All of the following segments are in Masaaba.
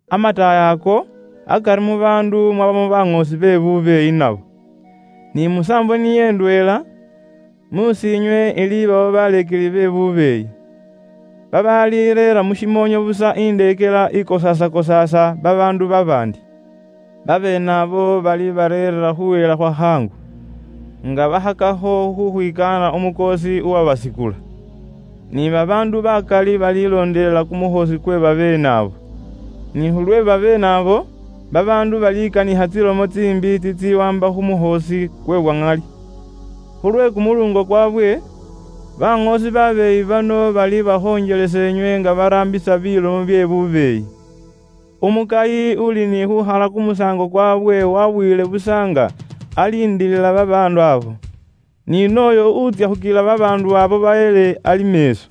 Amataayi ako, akari mu baandu mwabamo baŋoosi be bubeeyi nabo. Ni musaambo niyo indweela, mus'iinywe ilibawo baleekeli be bubeeyi, babaalireera mu shimoonyo busa indeekela ikosaasakosaasa babaandu babaandi. Babeene abo balibarereera khuhela khwa khaangu, nga bakhakakho khukhwikaana Umukoosi uwabakula ni bukusi. Ni babaandu bakali balilondelela kumukhoosi kwe babeene abo. Ni khulwe babeene abo, babaandu balikanikha tsilomo tsiimbi tsitsiwaamba khu mukhoosi kwe bwa ŋali. Khulwe kumuluungo kwaabwe, baŋoosi babeeyi bano balibakhonjelesa inywe nga baraambisa bilomo bye bubeeyi. Umukayi uuli ni khuukhala kumusaango kwaabwe waabuyile busa nga aliindilila babaandu abo, ni nooyo utsya khukila babaandu abo bahele ali meeso.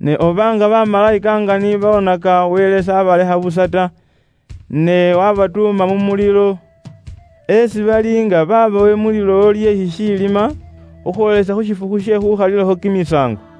Ne oba nga bamalayika nga ni boonaka Wele s'abalekha busa ta, ne waabatuuma mu mulilo, esi bali nga babowe mu lilowo lye shishiilima khukhwoolisa khu shifukhu she khuukhalilakho kimisaango.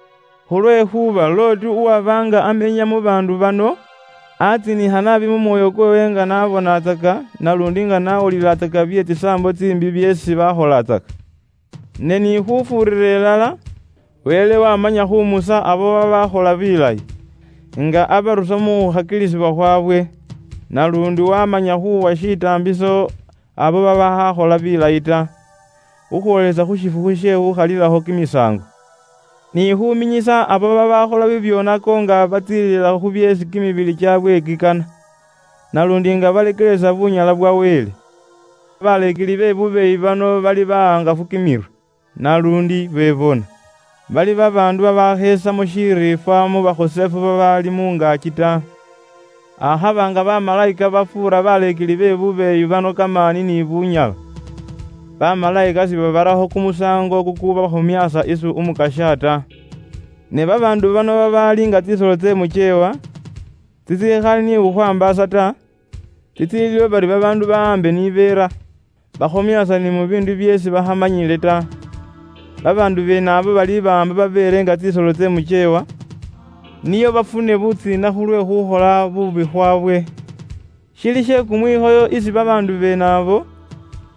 Khulwekhuuba Loti uwaba nga amenya mu baandu bano, aatsiinikha naabi mu mwoyo kweewe nga niye n'abonatsaka, naluundi nga n'awulilatsaka bye bubwoonaki byeesi nibo bakholatsaka. Ne ni khufuurira ilala, Wele waamanya khuumusa abo babaakhola bilayi, nga abarusa mu khukhakilisibwa khwaabwe. Naluundi waamanya khuuwa shitaambiso abo babaakhali babeyikinwa ta, khukhwoolisa khu shifukhu she khukhalilakho kimisaango. Ni khuuminyisa abo babaakhola bibyoonako nga batsiililila khu byeesi kimibili kyaabwe kikana, naluundi nga bafwotsola bunyala bwa Wele. Baleekeli be bubeeyi bano bali bahangafu kimirwe, naluundi bebona. Bali babaandu babaakhesamo shiriifwa mu bakhosefu babaali mu ngaaki ta. Akhaba nga bamalayika bafuura baleekeli be bubeeyi bano kamaani ni bunyala, bamalayika sibabarakho nibo kumusaango kukubafwootsola nibo isi Umukasya ta. Ne babaandu bano babaali nga tsisolo tsye mwiirome, tsitsikhali ni khukhwaambaasa ta, tsitsiiliwo bari babaandu bawambe ni beera, bakhomyaasa ni mu biindu byeesi bakhamanyile ta. Babaandu beene abo balibawaamba babeere nga tsisolo tsye mukyeewa, nio bafune butsiina khulwe buubi bwaabwe. Shili she kumwikhoyo isi babaandu beene abo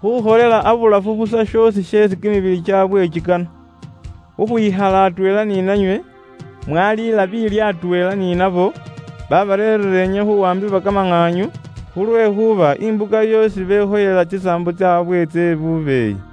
khukholela abulafu busa she bubwoonaki shoosi sheesi kimibili kyaabwe kikana. Khukhwikhala atweela ni nanywe, mwaliila biilyo atweela ni nabo, babarereera inywe khuwaambibwa kamaŋaanyu, khulwekhuuba imbuka yoosi bekhoyela tsisaambo tsaabwe tsye bubeeyi.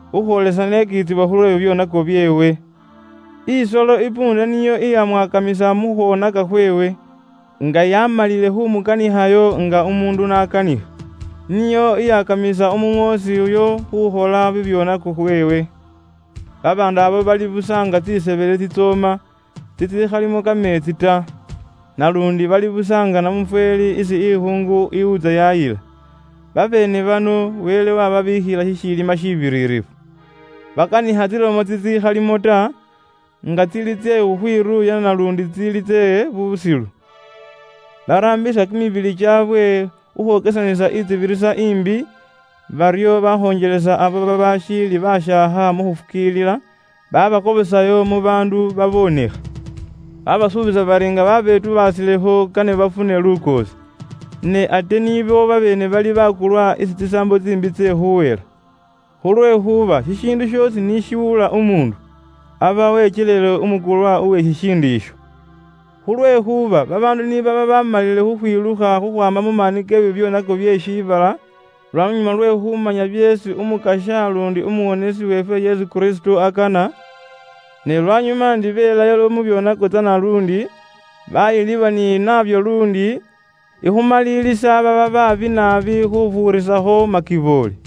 khukhwoolisa n'ekiitsibwa khulwe bibyoonako byeewe. Isolo isikilya niyo iyamwakamisa mu khwoneka khweewe, nga yaamalile khuumukanikhayo nga umuundu n'akanikha. Niyo iyakamisa umuŋoosi uyo khuukhola bibyoonako khweewe. Babaandu abo bali busa nga tsisebele tsitsooma, tsitsiikhalimo kameetsi ta. Naluundi bali busa nga namufweeli isi ikhuungu iwuutsa yaayila. Babeene bano Wele waababiikhila shishilima shiibiririfu. Bakanikha tsilomo tsitsikhalimo ta, nga tsili tsye khukhwiruuya naluundi tsili tsye busilu. Baraambisa kimibili kyaabwe khukhwokesanisa intsibirisa imbi, baryo bakhonjelesa abo babaashiili bashaakha mu khufukiilila, babakobosayo mu baandu baboonekha. Babasuubisa bari nga baabetubaasilekho kane bafune lukoosi, ne ate nibo babeene bali bakulwa isi tsisaambo tsiimbi tsye khuuhela. Khulwekhuuba shishiindu shoosi ni shiwula umuundu, aba wekyelile umukulwa uwe shishiindu isho. Khulwekhuuba babaandu ni baba baamalile khukhwilukha khukhwaama mu maani ke bibyoonako bye shiibala lwanyuma lwe khuumanya byeesi Umukasya luundi Umuwonesi weefwe Yesu Kristo akana, ne lwanyuma ndi beelayo mu byoonako tsana luundi, baayilibwa ni nabyo luundi, ikhumalilisa baaba baabi naabi khufuurisakho makiboole.